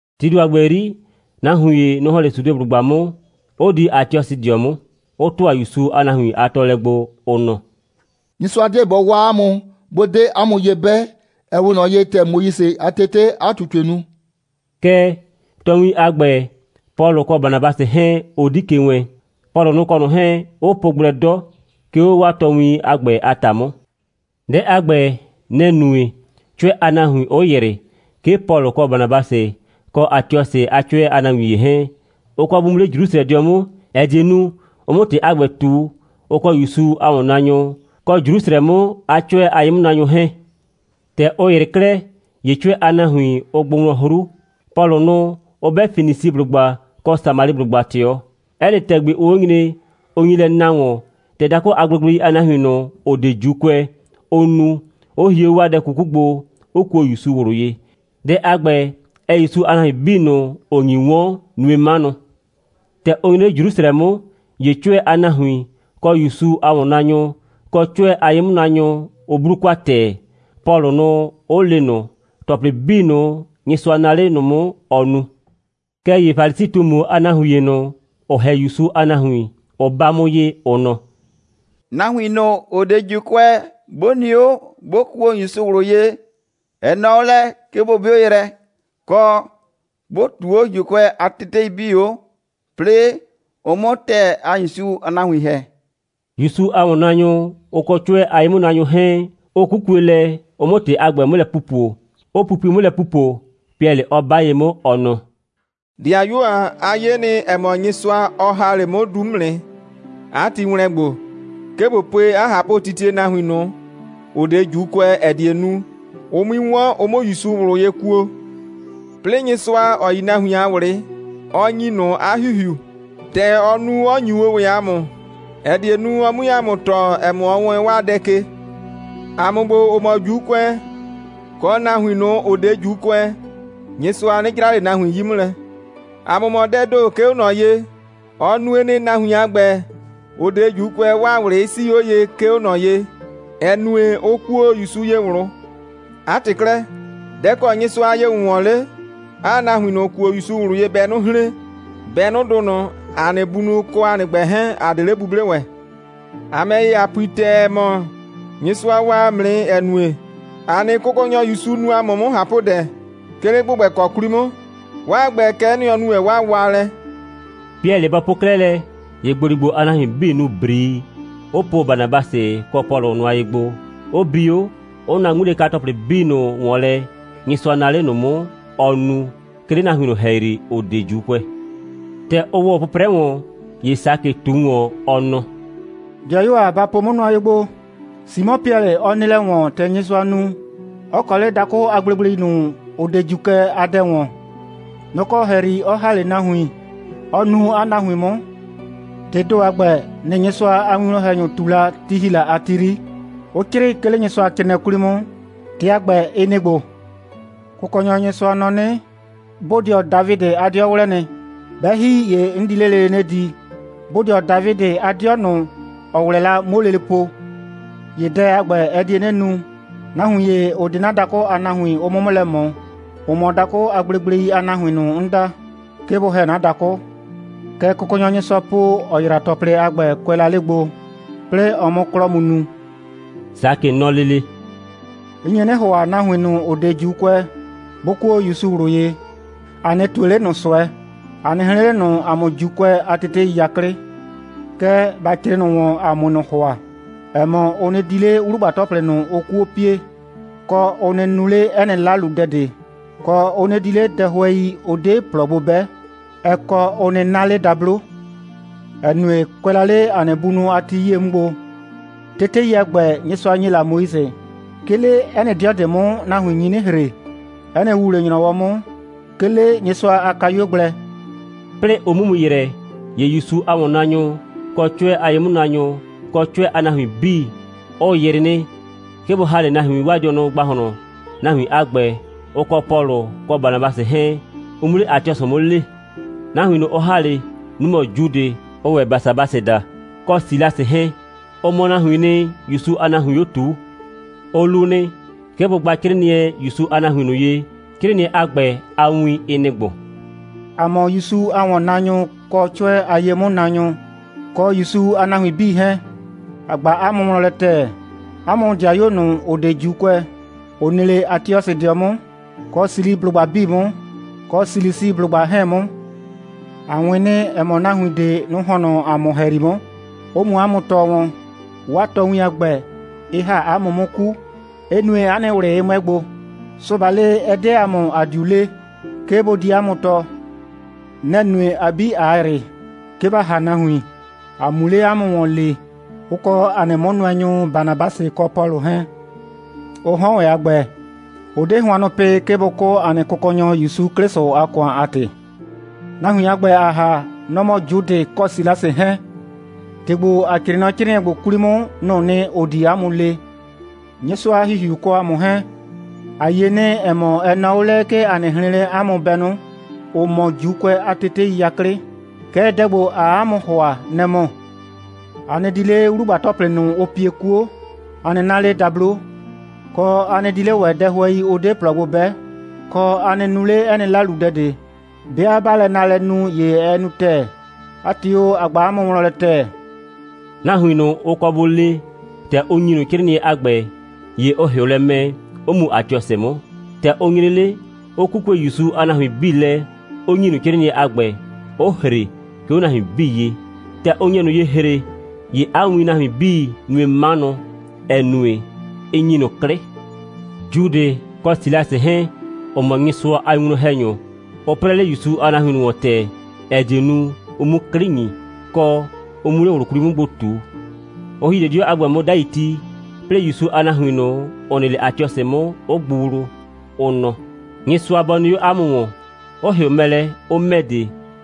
Tii ‑do a ‑gbɛ 'yri, nahuin ‑ye, nʋ‑ ‑hɔn 'le Sudeblʋgba 'mʋ, 'ʋ di Atiɔsɩdɩɔ 'mʋ, 'ʋ ‑tʋa ‑Yusu a nahuin a tɔɔlɛ gbo, ʋ nɔ: «Nyɩsʋa 'deɛ bɔ waa 'a mʋ, 'bʋ 'de 'a mʋ ye 'bɛ, ‑ɛ 'we ꞊nɔ ye, ‑tɛ Moise a tetee 'a ꞊tutue nu.» Kɛɛ, tɔɔwin a ‑gbɛ, Pɔlʋ kɔ Banabasɩ 'hɛɛn, ʋ 'di ke wɛɛn, Pɔlʋ nʋ kɔ ꞊nʋ 'hɛɛn, 'ʋ po gblɛ 'dɔ, 'ke 'o 'waa tɔɔwin a ‑gbɛ a ‑ta 'mʋ. Dɛ a ‑gbɛ, nɛ‑ nue, 'cʋɛ a nahuin 'ʋ ‑yrɩ, 'ke Pɔlʋ kɔ Banabasɩ kɔ Atiɔsɩ a 'cʋɛ a nahuin ‑ye 'hɛɛn, ʋ kɔ bʋ mu 'le Jrusrɛdɩɔ 'mʋ, ‑ɛ die nu, ʋ 'mʋ ‑tɩ a ‑gbɛ ꞊tu, ʋ kɔ ‑Yusu a ‑wɔnnaanyʋ, kɔ Jrusrɛ 'mʋ a 'cʋɛ a ye'mʋnaanyʋ 'hɛɛn. ‑Tɛ ʋ ‑yrɩ 'klɛɛ, ‑ye 'cʋɛ a nahuin, ʋ gbʋ wlɔn 'hru, Pɔlʋ nʋ 'ʋ 'bɛ Fenisiblʋgba kɔ Samaliblʋgba ꞊tɩɔ. 'Ɛ nɩ ‑tɛgbi, ʋʋ 'o nyre, ʋ nyi lɛ na ‑wɔn, ‑tɛ dakʋ a gblegblei a nahuin ꞊nʋ, ‑ʋ 'de ‑Juukʋɛ, ʋ nu, 'ʋ hie 'o 'waa dɛ 'kuku gbo, 'ʋ kuo ‑Yusu ꞊wlʋ ye. Dɛ a ‑gbɛ, ɛɛ ‑Yusu a nahuin 'bii ꞊nʋ, ‑ʋ nyi 'wɔn, nue 'manʋ. ‑Tɛ ʋ nyre 'le Jrusrɛ 'mʋ, ‑ye 'cʋɛ a nahuin, kɔ ‑Yusu a ‑wɔnnaanyʋ, kɔ 'cʋɛ a ye'mʋnaanyʋ, ʋ 'blu kwa ‑tɛɛ, Pɔlʋ nʋ 'ʋ le ꞊nʋ ‑tɔplɩ 'bii ꞊nʋ, Nyɩsʋa naa 'le ꞊nʋ 'mʋ, ɔ nu. Kɛɛ ‑ye Falisi꞊tumu a nahuin ‑ye ꞊nʋ, ‑ʋ ‑hɛ o ‑Yusu a nahuin, ʋ 'ba 'mʋ ye, ʋ nɔ: «Nahuin ꞊nʋ, ‑ʋ 'de ‑Juukʋɛ, 'bʋ nɩ 'o, 'bʋ kuo ‑Yusu ꞊wlʋ ye, ɛ nɔɔ 'o lɛ, 'ke bʋ 'bɩʋ yrɛ, kɔ, bʋ ꞊tuu 'o ‑Juukʋɛ a tetei 'bii 'o, 'plɩɩ ʋ 'mʋ ‑tɛɛ a ‑Yusu a nahuin ‑hɛ.» ‑Yusu a ‑wɔnnaanyʋ, ʋ kɔ 'cʋɛ a ye'mʋnaanyʋ 'hɛɛn, ʋ 'kukue lɛ, ʋ 'mʋ ‑tɩ a ‑gbɛ 'mʋ lɛ pupo, 'ʋ pupui 'mʋ lɛ ‑pupo, Piɛlɩ 'ɔ 'ba ye 'mʋ, ɔ nɔ: «‑Dɩayuo ‑a, a yie nɩ, ‑ɛ mɔ Nyɩsʋa, ɔ ‑ha 'le 'mʋ du 'mʋ nɩ, 'a ti ‑wlɛn gbo, 'ke ꞊bo pue 'a ꞊hapʋtitie nahuin ꞊nʋ, ‑ʋ 'de ‑Juukʋɛ, ‑ɛ die nu, ʋ 'mui 'wɔn, ʋ 'mʋ ‑Yusu ꞊wlʋ ye kuo. 'Plɩɩ, Nyɩsʋa, ‑ɔ yi nahuin a ꞊wlɩ, ɔ ‑nyi ꞊nʋ 'a ‑Hihiu, ‑tɛ ɔ nu, 'ɔ ‑nyu o ‑wɛ ‑a mʋ, ‑ɛ die nu, ɔ 'mue ‑a mʋ tɔɔ, ‑ɛ mɔ, ɔ wɛɛn 'waa dɛ ke. ‑A mʋ ‑gbo, ‑ʋ mɔ ‑Juukʋɛ, kɔ nahuin ꞊nʋ, ‑ʋ 'de ‑Juukʋɛ, Nyɩsʋa 'nɩ 'jra ꞊le nahuin 'yi 'mʋ lɛ. ‑A mʋ mɔ dɛɛ ‑do, 'ke 'o ꞊nɔ ye. Ɔ nue nɩ, nahuin a ‑gbɛ, ‑ʋ 'de ‑Juukʋɛ, 'waa ꞊wlɩ 'ɩ 'sii 'o ye, 'ke 'o ꞊nɔ ye, ‑ɛ nue, ʋ kuo ‑Yusu ye ꞊wlʋ. 'A ‑tɩ 'klɛɛ, dɛ‑ kɔ Nyɩsʋa a ye‑wʋnwɔn 'le, 'aa nahuin ꞊nʋ, ‑ʋ kuo ‑Yusu ꞊wlʋ ye bɛnʋ hren, bɛnʋdʋ ꞊nʋ, ‑a nɩ bunʋ kɔ ‑a nɩ ‑gbɛ 'hɛɛn, ‑a 'de 'le 'buble ‑wɛ. ‑A ‑mɛ ‑ye, ‑a pui ‑tɛɛ, ‑ɛ mɔ, Nyɩsʋa waa ‑a mʋ nɩ, ‑ɛ nue, ‑a nɩ Kʋkɔnyɔ ‑Yusu nu ‑a mʋ 'mʋ ꞊hapʋdɛ, 'ke 'le ‑gbʋgbɛkɔ 'kwli mʋ. 'Waa ‑gbɛ, kɛ'ɛ nɩ, ɔ nu ‑wɛ 'waa waalɛ.» Piɛlɩ bɔ po 'klɛɛ lɛ, ‑ye ‑gboligbo a nahuin 'bii nu ‑brii, 'ʋ po Banabasɩ kɔ Pɔlʋ nʋa ye gbo, 'ʋ bi 'o, 'ʋ na 'ŋmilɛka‑tɔplɩ 'bii ꞊nʋ ‑wɔn lɛ, Nyɩsʋa naa 'le ꞊nʋ 'mʋ, ɔ nu, 'ke 'le nahuin ꞊nʋ ‑hɛyri, ‑ʋ 'de ‑Juukʋɛ. ‑Tɛ ʋ ‑wɔ 'pʋprɛ ‑wɔn, ‑ye Sakɩ ꞊tu ‑wɔn, ɔ nɔ: «‑Dɩayuo ‑a, ba po 'mʋ nʋa ye gbo. Simɔ Piɛlɩ, ɔ nɩ lɛ ‑wɔn, ‑tɛ Nyɩsʋa nu, 'ɔ kɔ 'le dakʋ a gblegblei ꞊nʋ, ‑ʋ 'de ‑Juukʋɛ a dɛ ‑wɔn. Nɔ‑ kɔ ‑hɛyri ɔ ‑ha 'le nahuin, 'ɔ nuu 'a nahuin 'mʋ. ‑Tɩɩ ‑do a ‑gbɛ, nɩ‑ Nyɩsʋa a winwlɔn‑hɛnyʋ ꞊tu la, ti ‑hi la a ti 'yri, 'ʋ 'crɩɩ, 'ke 'le Nyɩsʋacrɩɩnɩɛ 'kwli 'mʋ. ‑Tɩ a ‑gbɛ, ɩ nɩ‑ ‑gbo: Kʋkɔnyɔ Nyɩsʋa nɔ 'nɩ: Bodɩɔ Dafidɩ a 'dɩɔ 'wlɛ nɩ. 'Bɛ ‑hi, ‑ye 'n di 'le lele 'nɩ di, bodɩɔ Dafidɩ a 'dɩɔ ꞊nʋ, ‑ɔ 'wlɛ la, 'muo lele po. ‑Ye dɛ a ‑gbɛ, ɛ die 'nɩ nu, nahuin ‑ye, ‑ʋ 'de 'na dakʋ a nahuin, ʋ 'mʋ 'mʋ lɛ ꞊mɔ, ‑ʋ mɔ dakʋ a gblegblei a nahuin ꞊nʋ, 'n da, 'ke bʋ ‑hɛ 'na dakʋ. Kɛ Kʋkɔnyɔ Nyɩsʋa po, ‑ɔ ‑yra ‑tɔplɩ a ‑gbɛ, kʋɛ la 'le gbo, 'plɩɩ ɔ 'mʋ 'klɔ mu nu.» Sakɩ nɔ lele: «'N nye 'nɩ ‑hʋa, nahuin ꞊nʋ, ‑ʋ 'de ‑Juukʋɛ, 'bʋ kuo ‑Yusu ꞊wlʋ ye, ‑a 'nɩ ꞊tue 'le ꞊nʋ ꞊sʋɛ, ‑a 'nɩ hren 'le ꞊nʋ ‑a mʋ ‑Juukʋɛ a tetei 'yaklɩ. Kɛɛ, ‑ba 'crɩɩ ꞊nʋ ‑wɔn, ‑a 'mue ꞊nʋ ‑hʋa, ‑ɛ mɔ, ʋ nɩ di 'le 'wlugba‑tɔplɩ ꞊nʋ, ʋʋ 'kuo pie, kɔ, ʋ nɩ nu 'le 'ɛ nɩ 'laludɛ ꞊de, kɔ, ʋ nɩ di 'le dɛhʋɛi, ʋ 'de ‑plɔ gbo 'bɛ, ɛ kɔ, ʋ nɩ 'na 'le dablo, ‑ɛ nue, kʋɛ la 'le ‑a nɩ bunʋ a ti 'yie 'mʋ gbo, tetei a ‑gbɛ, Nyɩsʋa ‑nye la Moise, 'ke 'le 'ɛ nɩ 'dɩɔ ꞊de 'mʋ, nahuin nyi 'nɩ ‑hre, 'ɛ nɩ ‑wuwle‑nyrɔwɔ 'mʋ, 'ke 'le Nyɩsʋa a kayuo gblɛ.» 'Plɩɩ ʋ 'mu mu ‑yrɛ, ‑ye ‑Yusu a ‑wɔnnaanyʋ, kɔ 'cʋɛ a ye'mʋnaanyʋ, kɔ 'cʋɛ a nahuin 'bii, ʋ ‑yrɩ nɩ, 'ke bʋ ‑ha 'le nahuin 'waa dɩɔnʋ ‑gbahlɔn, nahuin a ‑gbɛ, ʋ kɔ Pɔlʋ kɔ Banabasɩ 'hɛɛn, ʋ 'mu 'le Atiɔsɩ 'mʋ lee. Nahuin ꞊nʋ, ʋ ‑ha 'le, nʋ‑ mɔ Judɩ, ʋʋ ‑wɛ Basabasɩ daa, kɔ Silasɩ 'hɛɛn. Ʋ mɔ nahuiin nɩ, ‑Yusu a nahuiin 'o ꞊tuu. Ʋ lu nɩ, 'ke bʋ gba 'crɩɩnɩɛ ‑Yusu a nahuin ꞊nʋ ye, ‑ʋ nɩ 'le Atiɔsɩ 'mʋ. 'Crɩɩnɩɛ a ‑gbɛ, 'a win, ɩ nɩ‑ ‑gbo: «‑A mʋ ‑Yusu a ‑wɔnnaanyʋ, kɔ 'cʋɛ a ye'mʋnaanyʋ, kɔ ‑Yusu a nahuin 'bii 'hɛɛn, ‑a ꞊gba 'a mʋ wlɔn lɛ ‑tɛɛ, 'a mʋ ‑dɩayuo ꞊nʋ, ‑ʋ 'de ‑Juukʋɛ, ‑ʋ nɩ 'le Atiɔsɩdɩɔ 'mʋ, kɔ Siliblʋgba 'bii 'mʋ, kɔ Silisiblʋgba 'hɛɛn 'mʋ. ‑A 'wɩn nɩ, ‑ɛ mɔ, nahuin ꞊de, nʋ‑ ‑hɔn nɔ ‑a mʋ ‑hɛyri 'mʋ, 'ʋ mu 'a mʋ tɔɔ wɔn. 'Waa tɔɔwin a ‑gbɛ, ɩ ‑ha 'a mʋ 'mʋ 'ku, 'ɩ nue, 'a nɩ ꞊wlɩ 'ɩ 'mʋɛ gbo. Sʋbalɩ, ɛ 'de ‑a mʋ, ‑a 'diu le, 'ke bʋ di 'a mʋ tɔɔ. Nɛ‑ nue, ‑a 'bii, ꞊a ‑yrɩ, 'ke ‑ba ‑ha nahuin, ‑a 'mu 'le 'a mʋ ‑wɔn lee, ʋ kɔ ‑a nɩ 'mʋnʋɛnyʋ Banabasɩ kɔ Pɔlʋ 'hɛɛn. Ʋ 'hɔn ‑wɛ a ‑gbɛ, ʋ 'de hʋannʋ pɩ, 'ke bʋ 'kʋ, ‑a nɩ Kʋkɔnyɔ ‑Yusu 'Klɩsʋ a ‑kʋan a ‑tɩ. Nahuin a ‑gbɛ, ‑a ‑ha, nʋ‑ mɔ Judɩ kɔ Silasɩ 'hɛɛn. ‑Tɩ ‑gbo, ‑a 'crɩɩ nɔ 'crɩɩnɩɛ ‑gbo 'kwli 'mʋ, nʋ‑ʋ nɩ, ‑ʋ di 'a mʋ le. Nyɩsʋa a ‑Hihiu, ʋ kɔ ‑a mʋ 'hɛɛn, ‑a 'ye nɩ, ‑ɛ mɔ, ɛ nɔɔ 'o lɛ, 'ke ‑a nɩ hren 'le 'a mʋ bɛnʋ, ‑ʋ mɔ ‑Juukʋɛ a tetei 'yaklɩ. Kɛɛ, dɛ ‑gbo, ‑aa 'a mʋ ‑hʋa, nɛ‑ mɔ: A nɩ di 'le 'wlugba‑tɔplɩ ꞊nʋ, ʋ pie 'kuo, kɔ, a nɩ 'na 'le dablo, kɔ, a nɩ di 'le ‑wɛ dɛhʋɛi, ʋ 'de ‑plɔ gbo 'bɛ, kɔ, a nɩ nu 'le 'ɛ nɩ 'laludɛ ꞊de. 'Bɩa 'baa lɛ naalɛ nu, ‑ye ɛ nu ‑tɛɛ. 'A ‑tɩ o, ‑a ꞊gba 'a mʋ wlɔn lɛ ‑tɛɛ.» Nahuin ꞊nʋ, ʋ kɔ bʋ lee, ‑tɛ ʋ ‑nyi ꞊nʋ 'crɩɩnɩɛ a ‑gbɛ, ‑ye ʋ ‑hɩʋ lɛ mɛ, 'ʋ mu Atiɔsɩ 'mʋ. ‑Tɛ ʋ nyre 'le, ʋ 'kukue ‑Yusu a nahuin 'bii lɛ, 'ʋ ‑nyi ꞊nʋ 'crɩɩnɩɛ a ‑gbɛ, 'ʋ ‑hre, 'ke 'o nahuin 'bii ye. ‑Tɛ ʋ nye ꞊nʋ ye ‑hre, ‑ye 'a wiin nahuin 'bii nue 'manʋ, ‑ɛ nue, ɩ ‑nyi ꞊nʋ 'klɩ. Judɩ kɔ Silasɩ 'hɛɛn, ‑ʋ mɔ Nyɩsʋa a winwlɔn‑hɛnyʋ, ʋ 'prɛɛ 'le ‑Yusu a nahuin ꞊nʋ ‑wɔn ‑tɛɛ, ‑ɛ die nu, ʋ 'mu 'klɩ ‑nyi, kɔ, ʋ 'mu 'le ꞊wlʋ 'kwli 'mʋ gbo ꞊tu. Ʋ ‑hi 'le 'dɩɔ a ‑gbɛ 'mʋ 'dai ti, 'plɩɩ ‑Yusu a nahuin ꞊nʋ, ‑ʋ nɩ 'le Atiɔsɩ 'mʋ, 'ʋ gbʋ wlu, ʋ nɔ: «Nyɩsʋa bɔ nɩ 'o 'a mʋ ‑wɔn,» 'ʋ ‑hɩʋ mɛ lɛ, 'ʋ ‑mɛ de,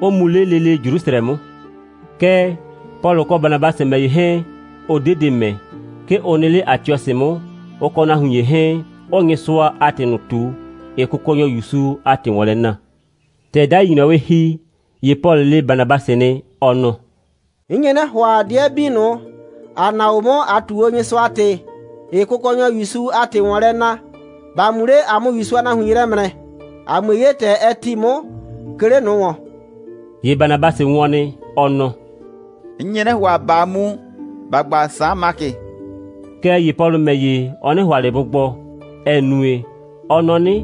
'ʋ mu 'le lele Jrusrɛ 'mʋ. Kɛɛ, Pɔlʋ kɔ Banabasɩ ‑mɛ ‑ye 'hɛɛn, ʋ 'de de ‑mɛ. 'Ke ʋ nɩ 'le Atiɔsɩ 'mʋ, ʋ kɔ nahuin ‑ye 'hɛɛn, 'ʋʋ Nyɩsʋa a ‑tɩ ꞊nʋ ꞊tu, ‑ɩɩ Kʋkɔnyʋ ‑Yusu a ‑tɩ ‑wɔn lɛ na. ‑Tɛ 'dai ‑nyrɔwɩ ‑hi, ‑ye Pɔlʋ le Banabasɩ nɩ, ɔ nɔ: «'N nye 'nɩ ‑hʋa, 'dɩɛ 'bii ꞊nʋ, ‑a na o 'mʋ, ꞊a ꞊tu Nyɩsʋa a ‑tɩ, ‑ɩɩ Kʋkɔnyɔ ‑Yusu a ‑tɩ ‑wɔn lɛ na, ‑ba mu 'le, ‑a 'mʋ ‑Yusu a nahuin ye ‑mrɛ, ‑a 'mue 'ye, ‑tɛ ɛ ‑ti 'mʋ, 'ke 'le ꞊nʋ ‑wɔn.» ‑Ye Banabasɩ wɔn nɩ, ɔ nɔ: «'N nye 'nɩ ‑hʋa, ꞊baa mu, ‑ba gba Saan Makɩ.» Kɛɛ ‑ye Pɔlʋ ‑mɛ ‑ye, ɔ 'nɩ ‑hʋa ꞊le bʋ gbɔ, ‑ɛ nue, ɔ nɔ 'nɩ,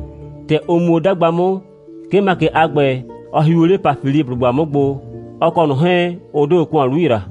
‑tɛ ʋ mu o 'dagba 'mʋ, 'ke Makɩ a ‑gbɛ, ɔ hiu 'le Pafiliblʋgba 'mʋ gbo, ɔ kɔ ꞊nʋ 'hɛɛn, ʋ 'de ‑kʋan 'lu ‑yra.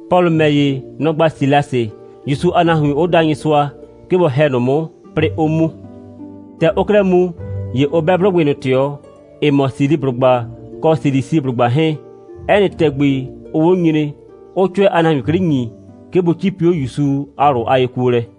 Pɔlʋ ‑mɛ ‑ye, nɔ‑ gba Silasɩ, ‑Yusu a nahuin 'ʋ da Nyɩsʋa, 'ke bɔ ‑hɛ ꞊nʋ 'mʋ, 'plɩɩ 'ʋ mu. ‑Tɛ ʋʋ 'klɛɛ mu, ‑ye ʋ 'bɛ 'blʋgbɩ ꞊nʋ ꞊tɩɔ, ‑ɩ mɔ Siliblʋgba kɔ Silisiblʋgba 'hɛɛn. 'Ɛ nɩ ‑tɛgbi, ʋʋ 'o nyre, 'ʋʋ 'cʋɛ a nahuin 'klɩ ‑nyi, 'ke bʋ 'cipi 'o ‑Yusu a ꞊wlʋ a yekuolɛ.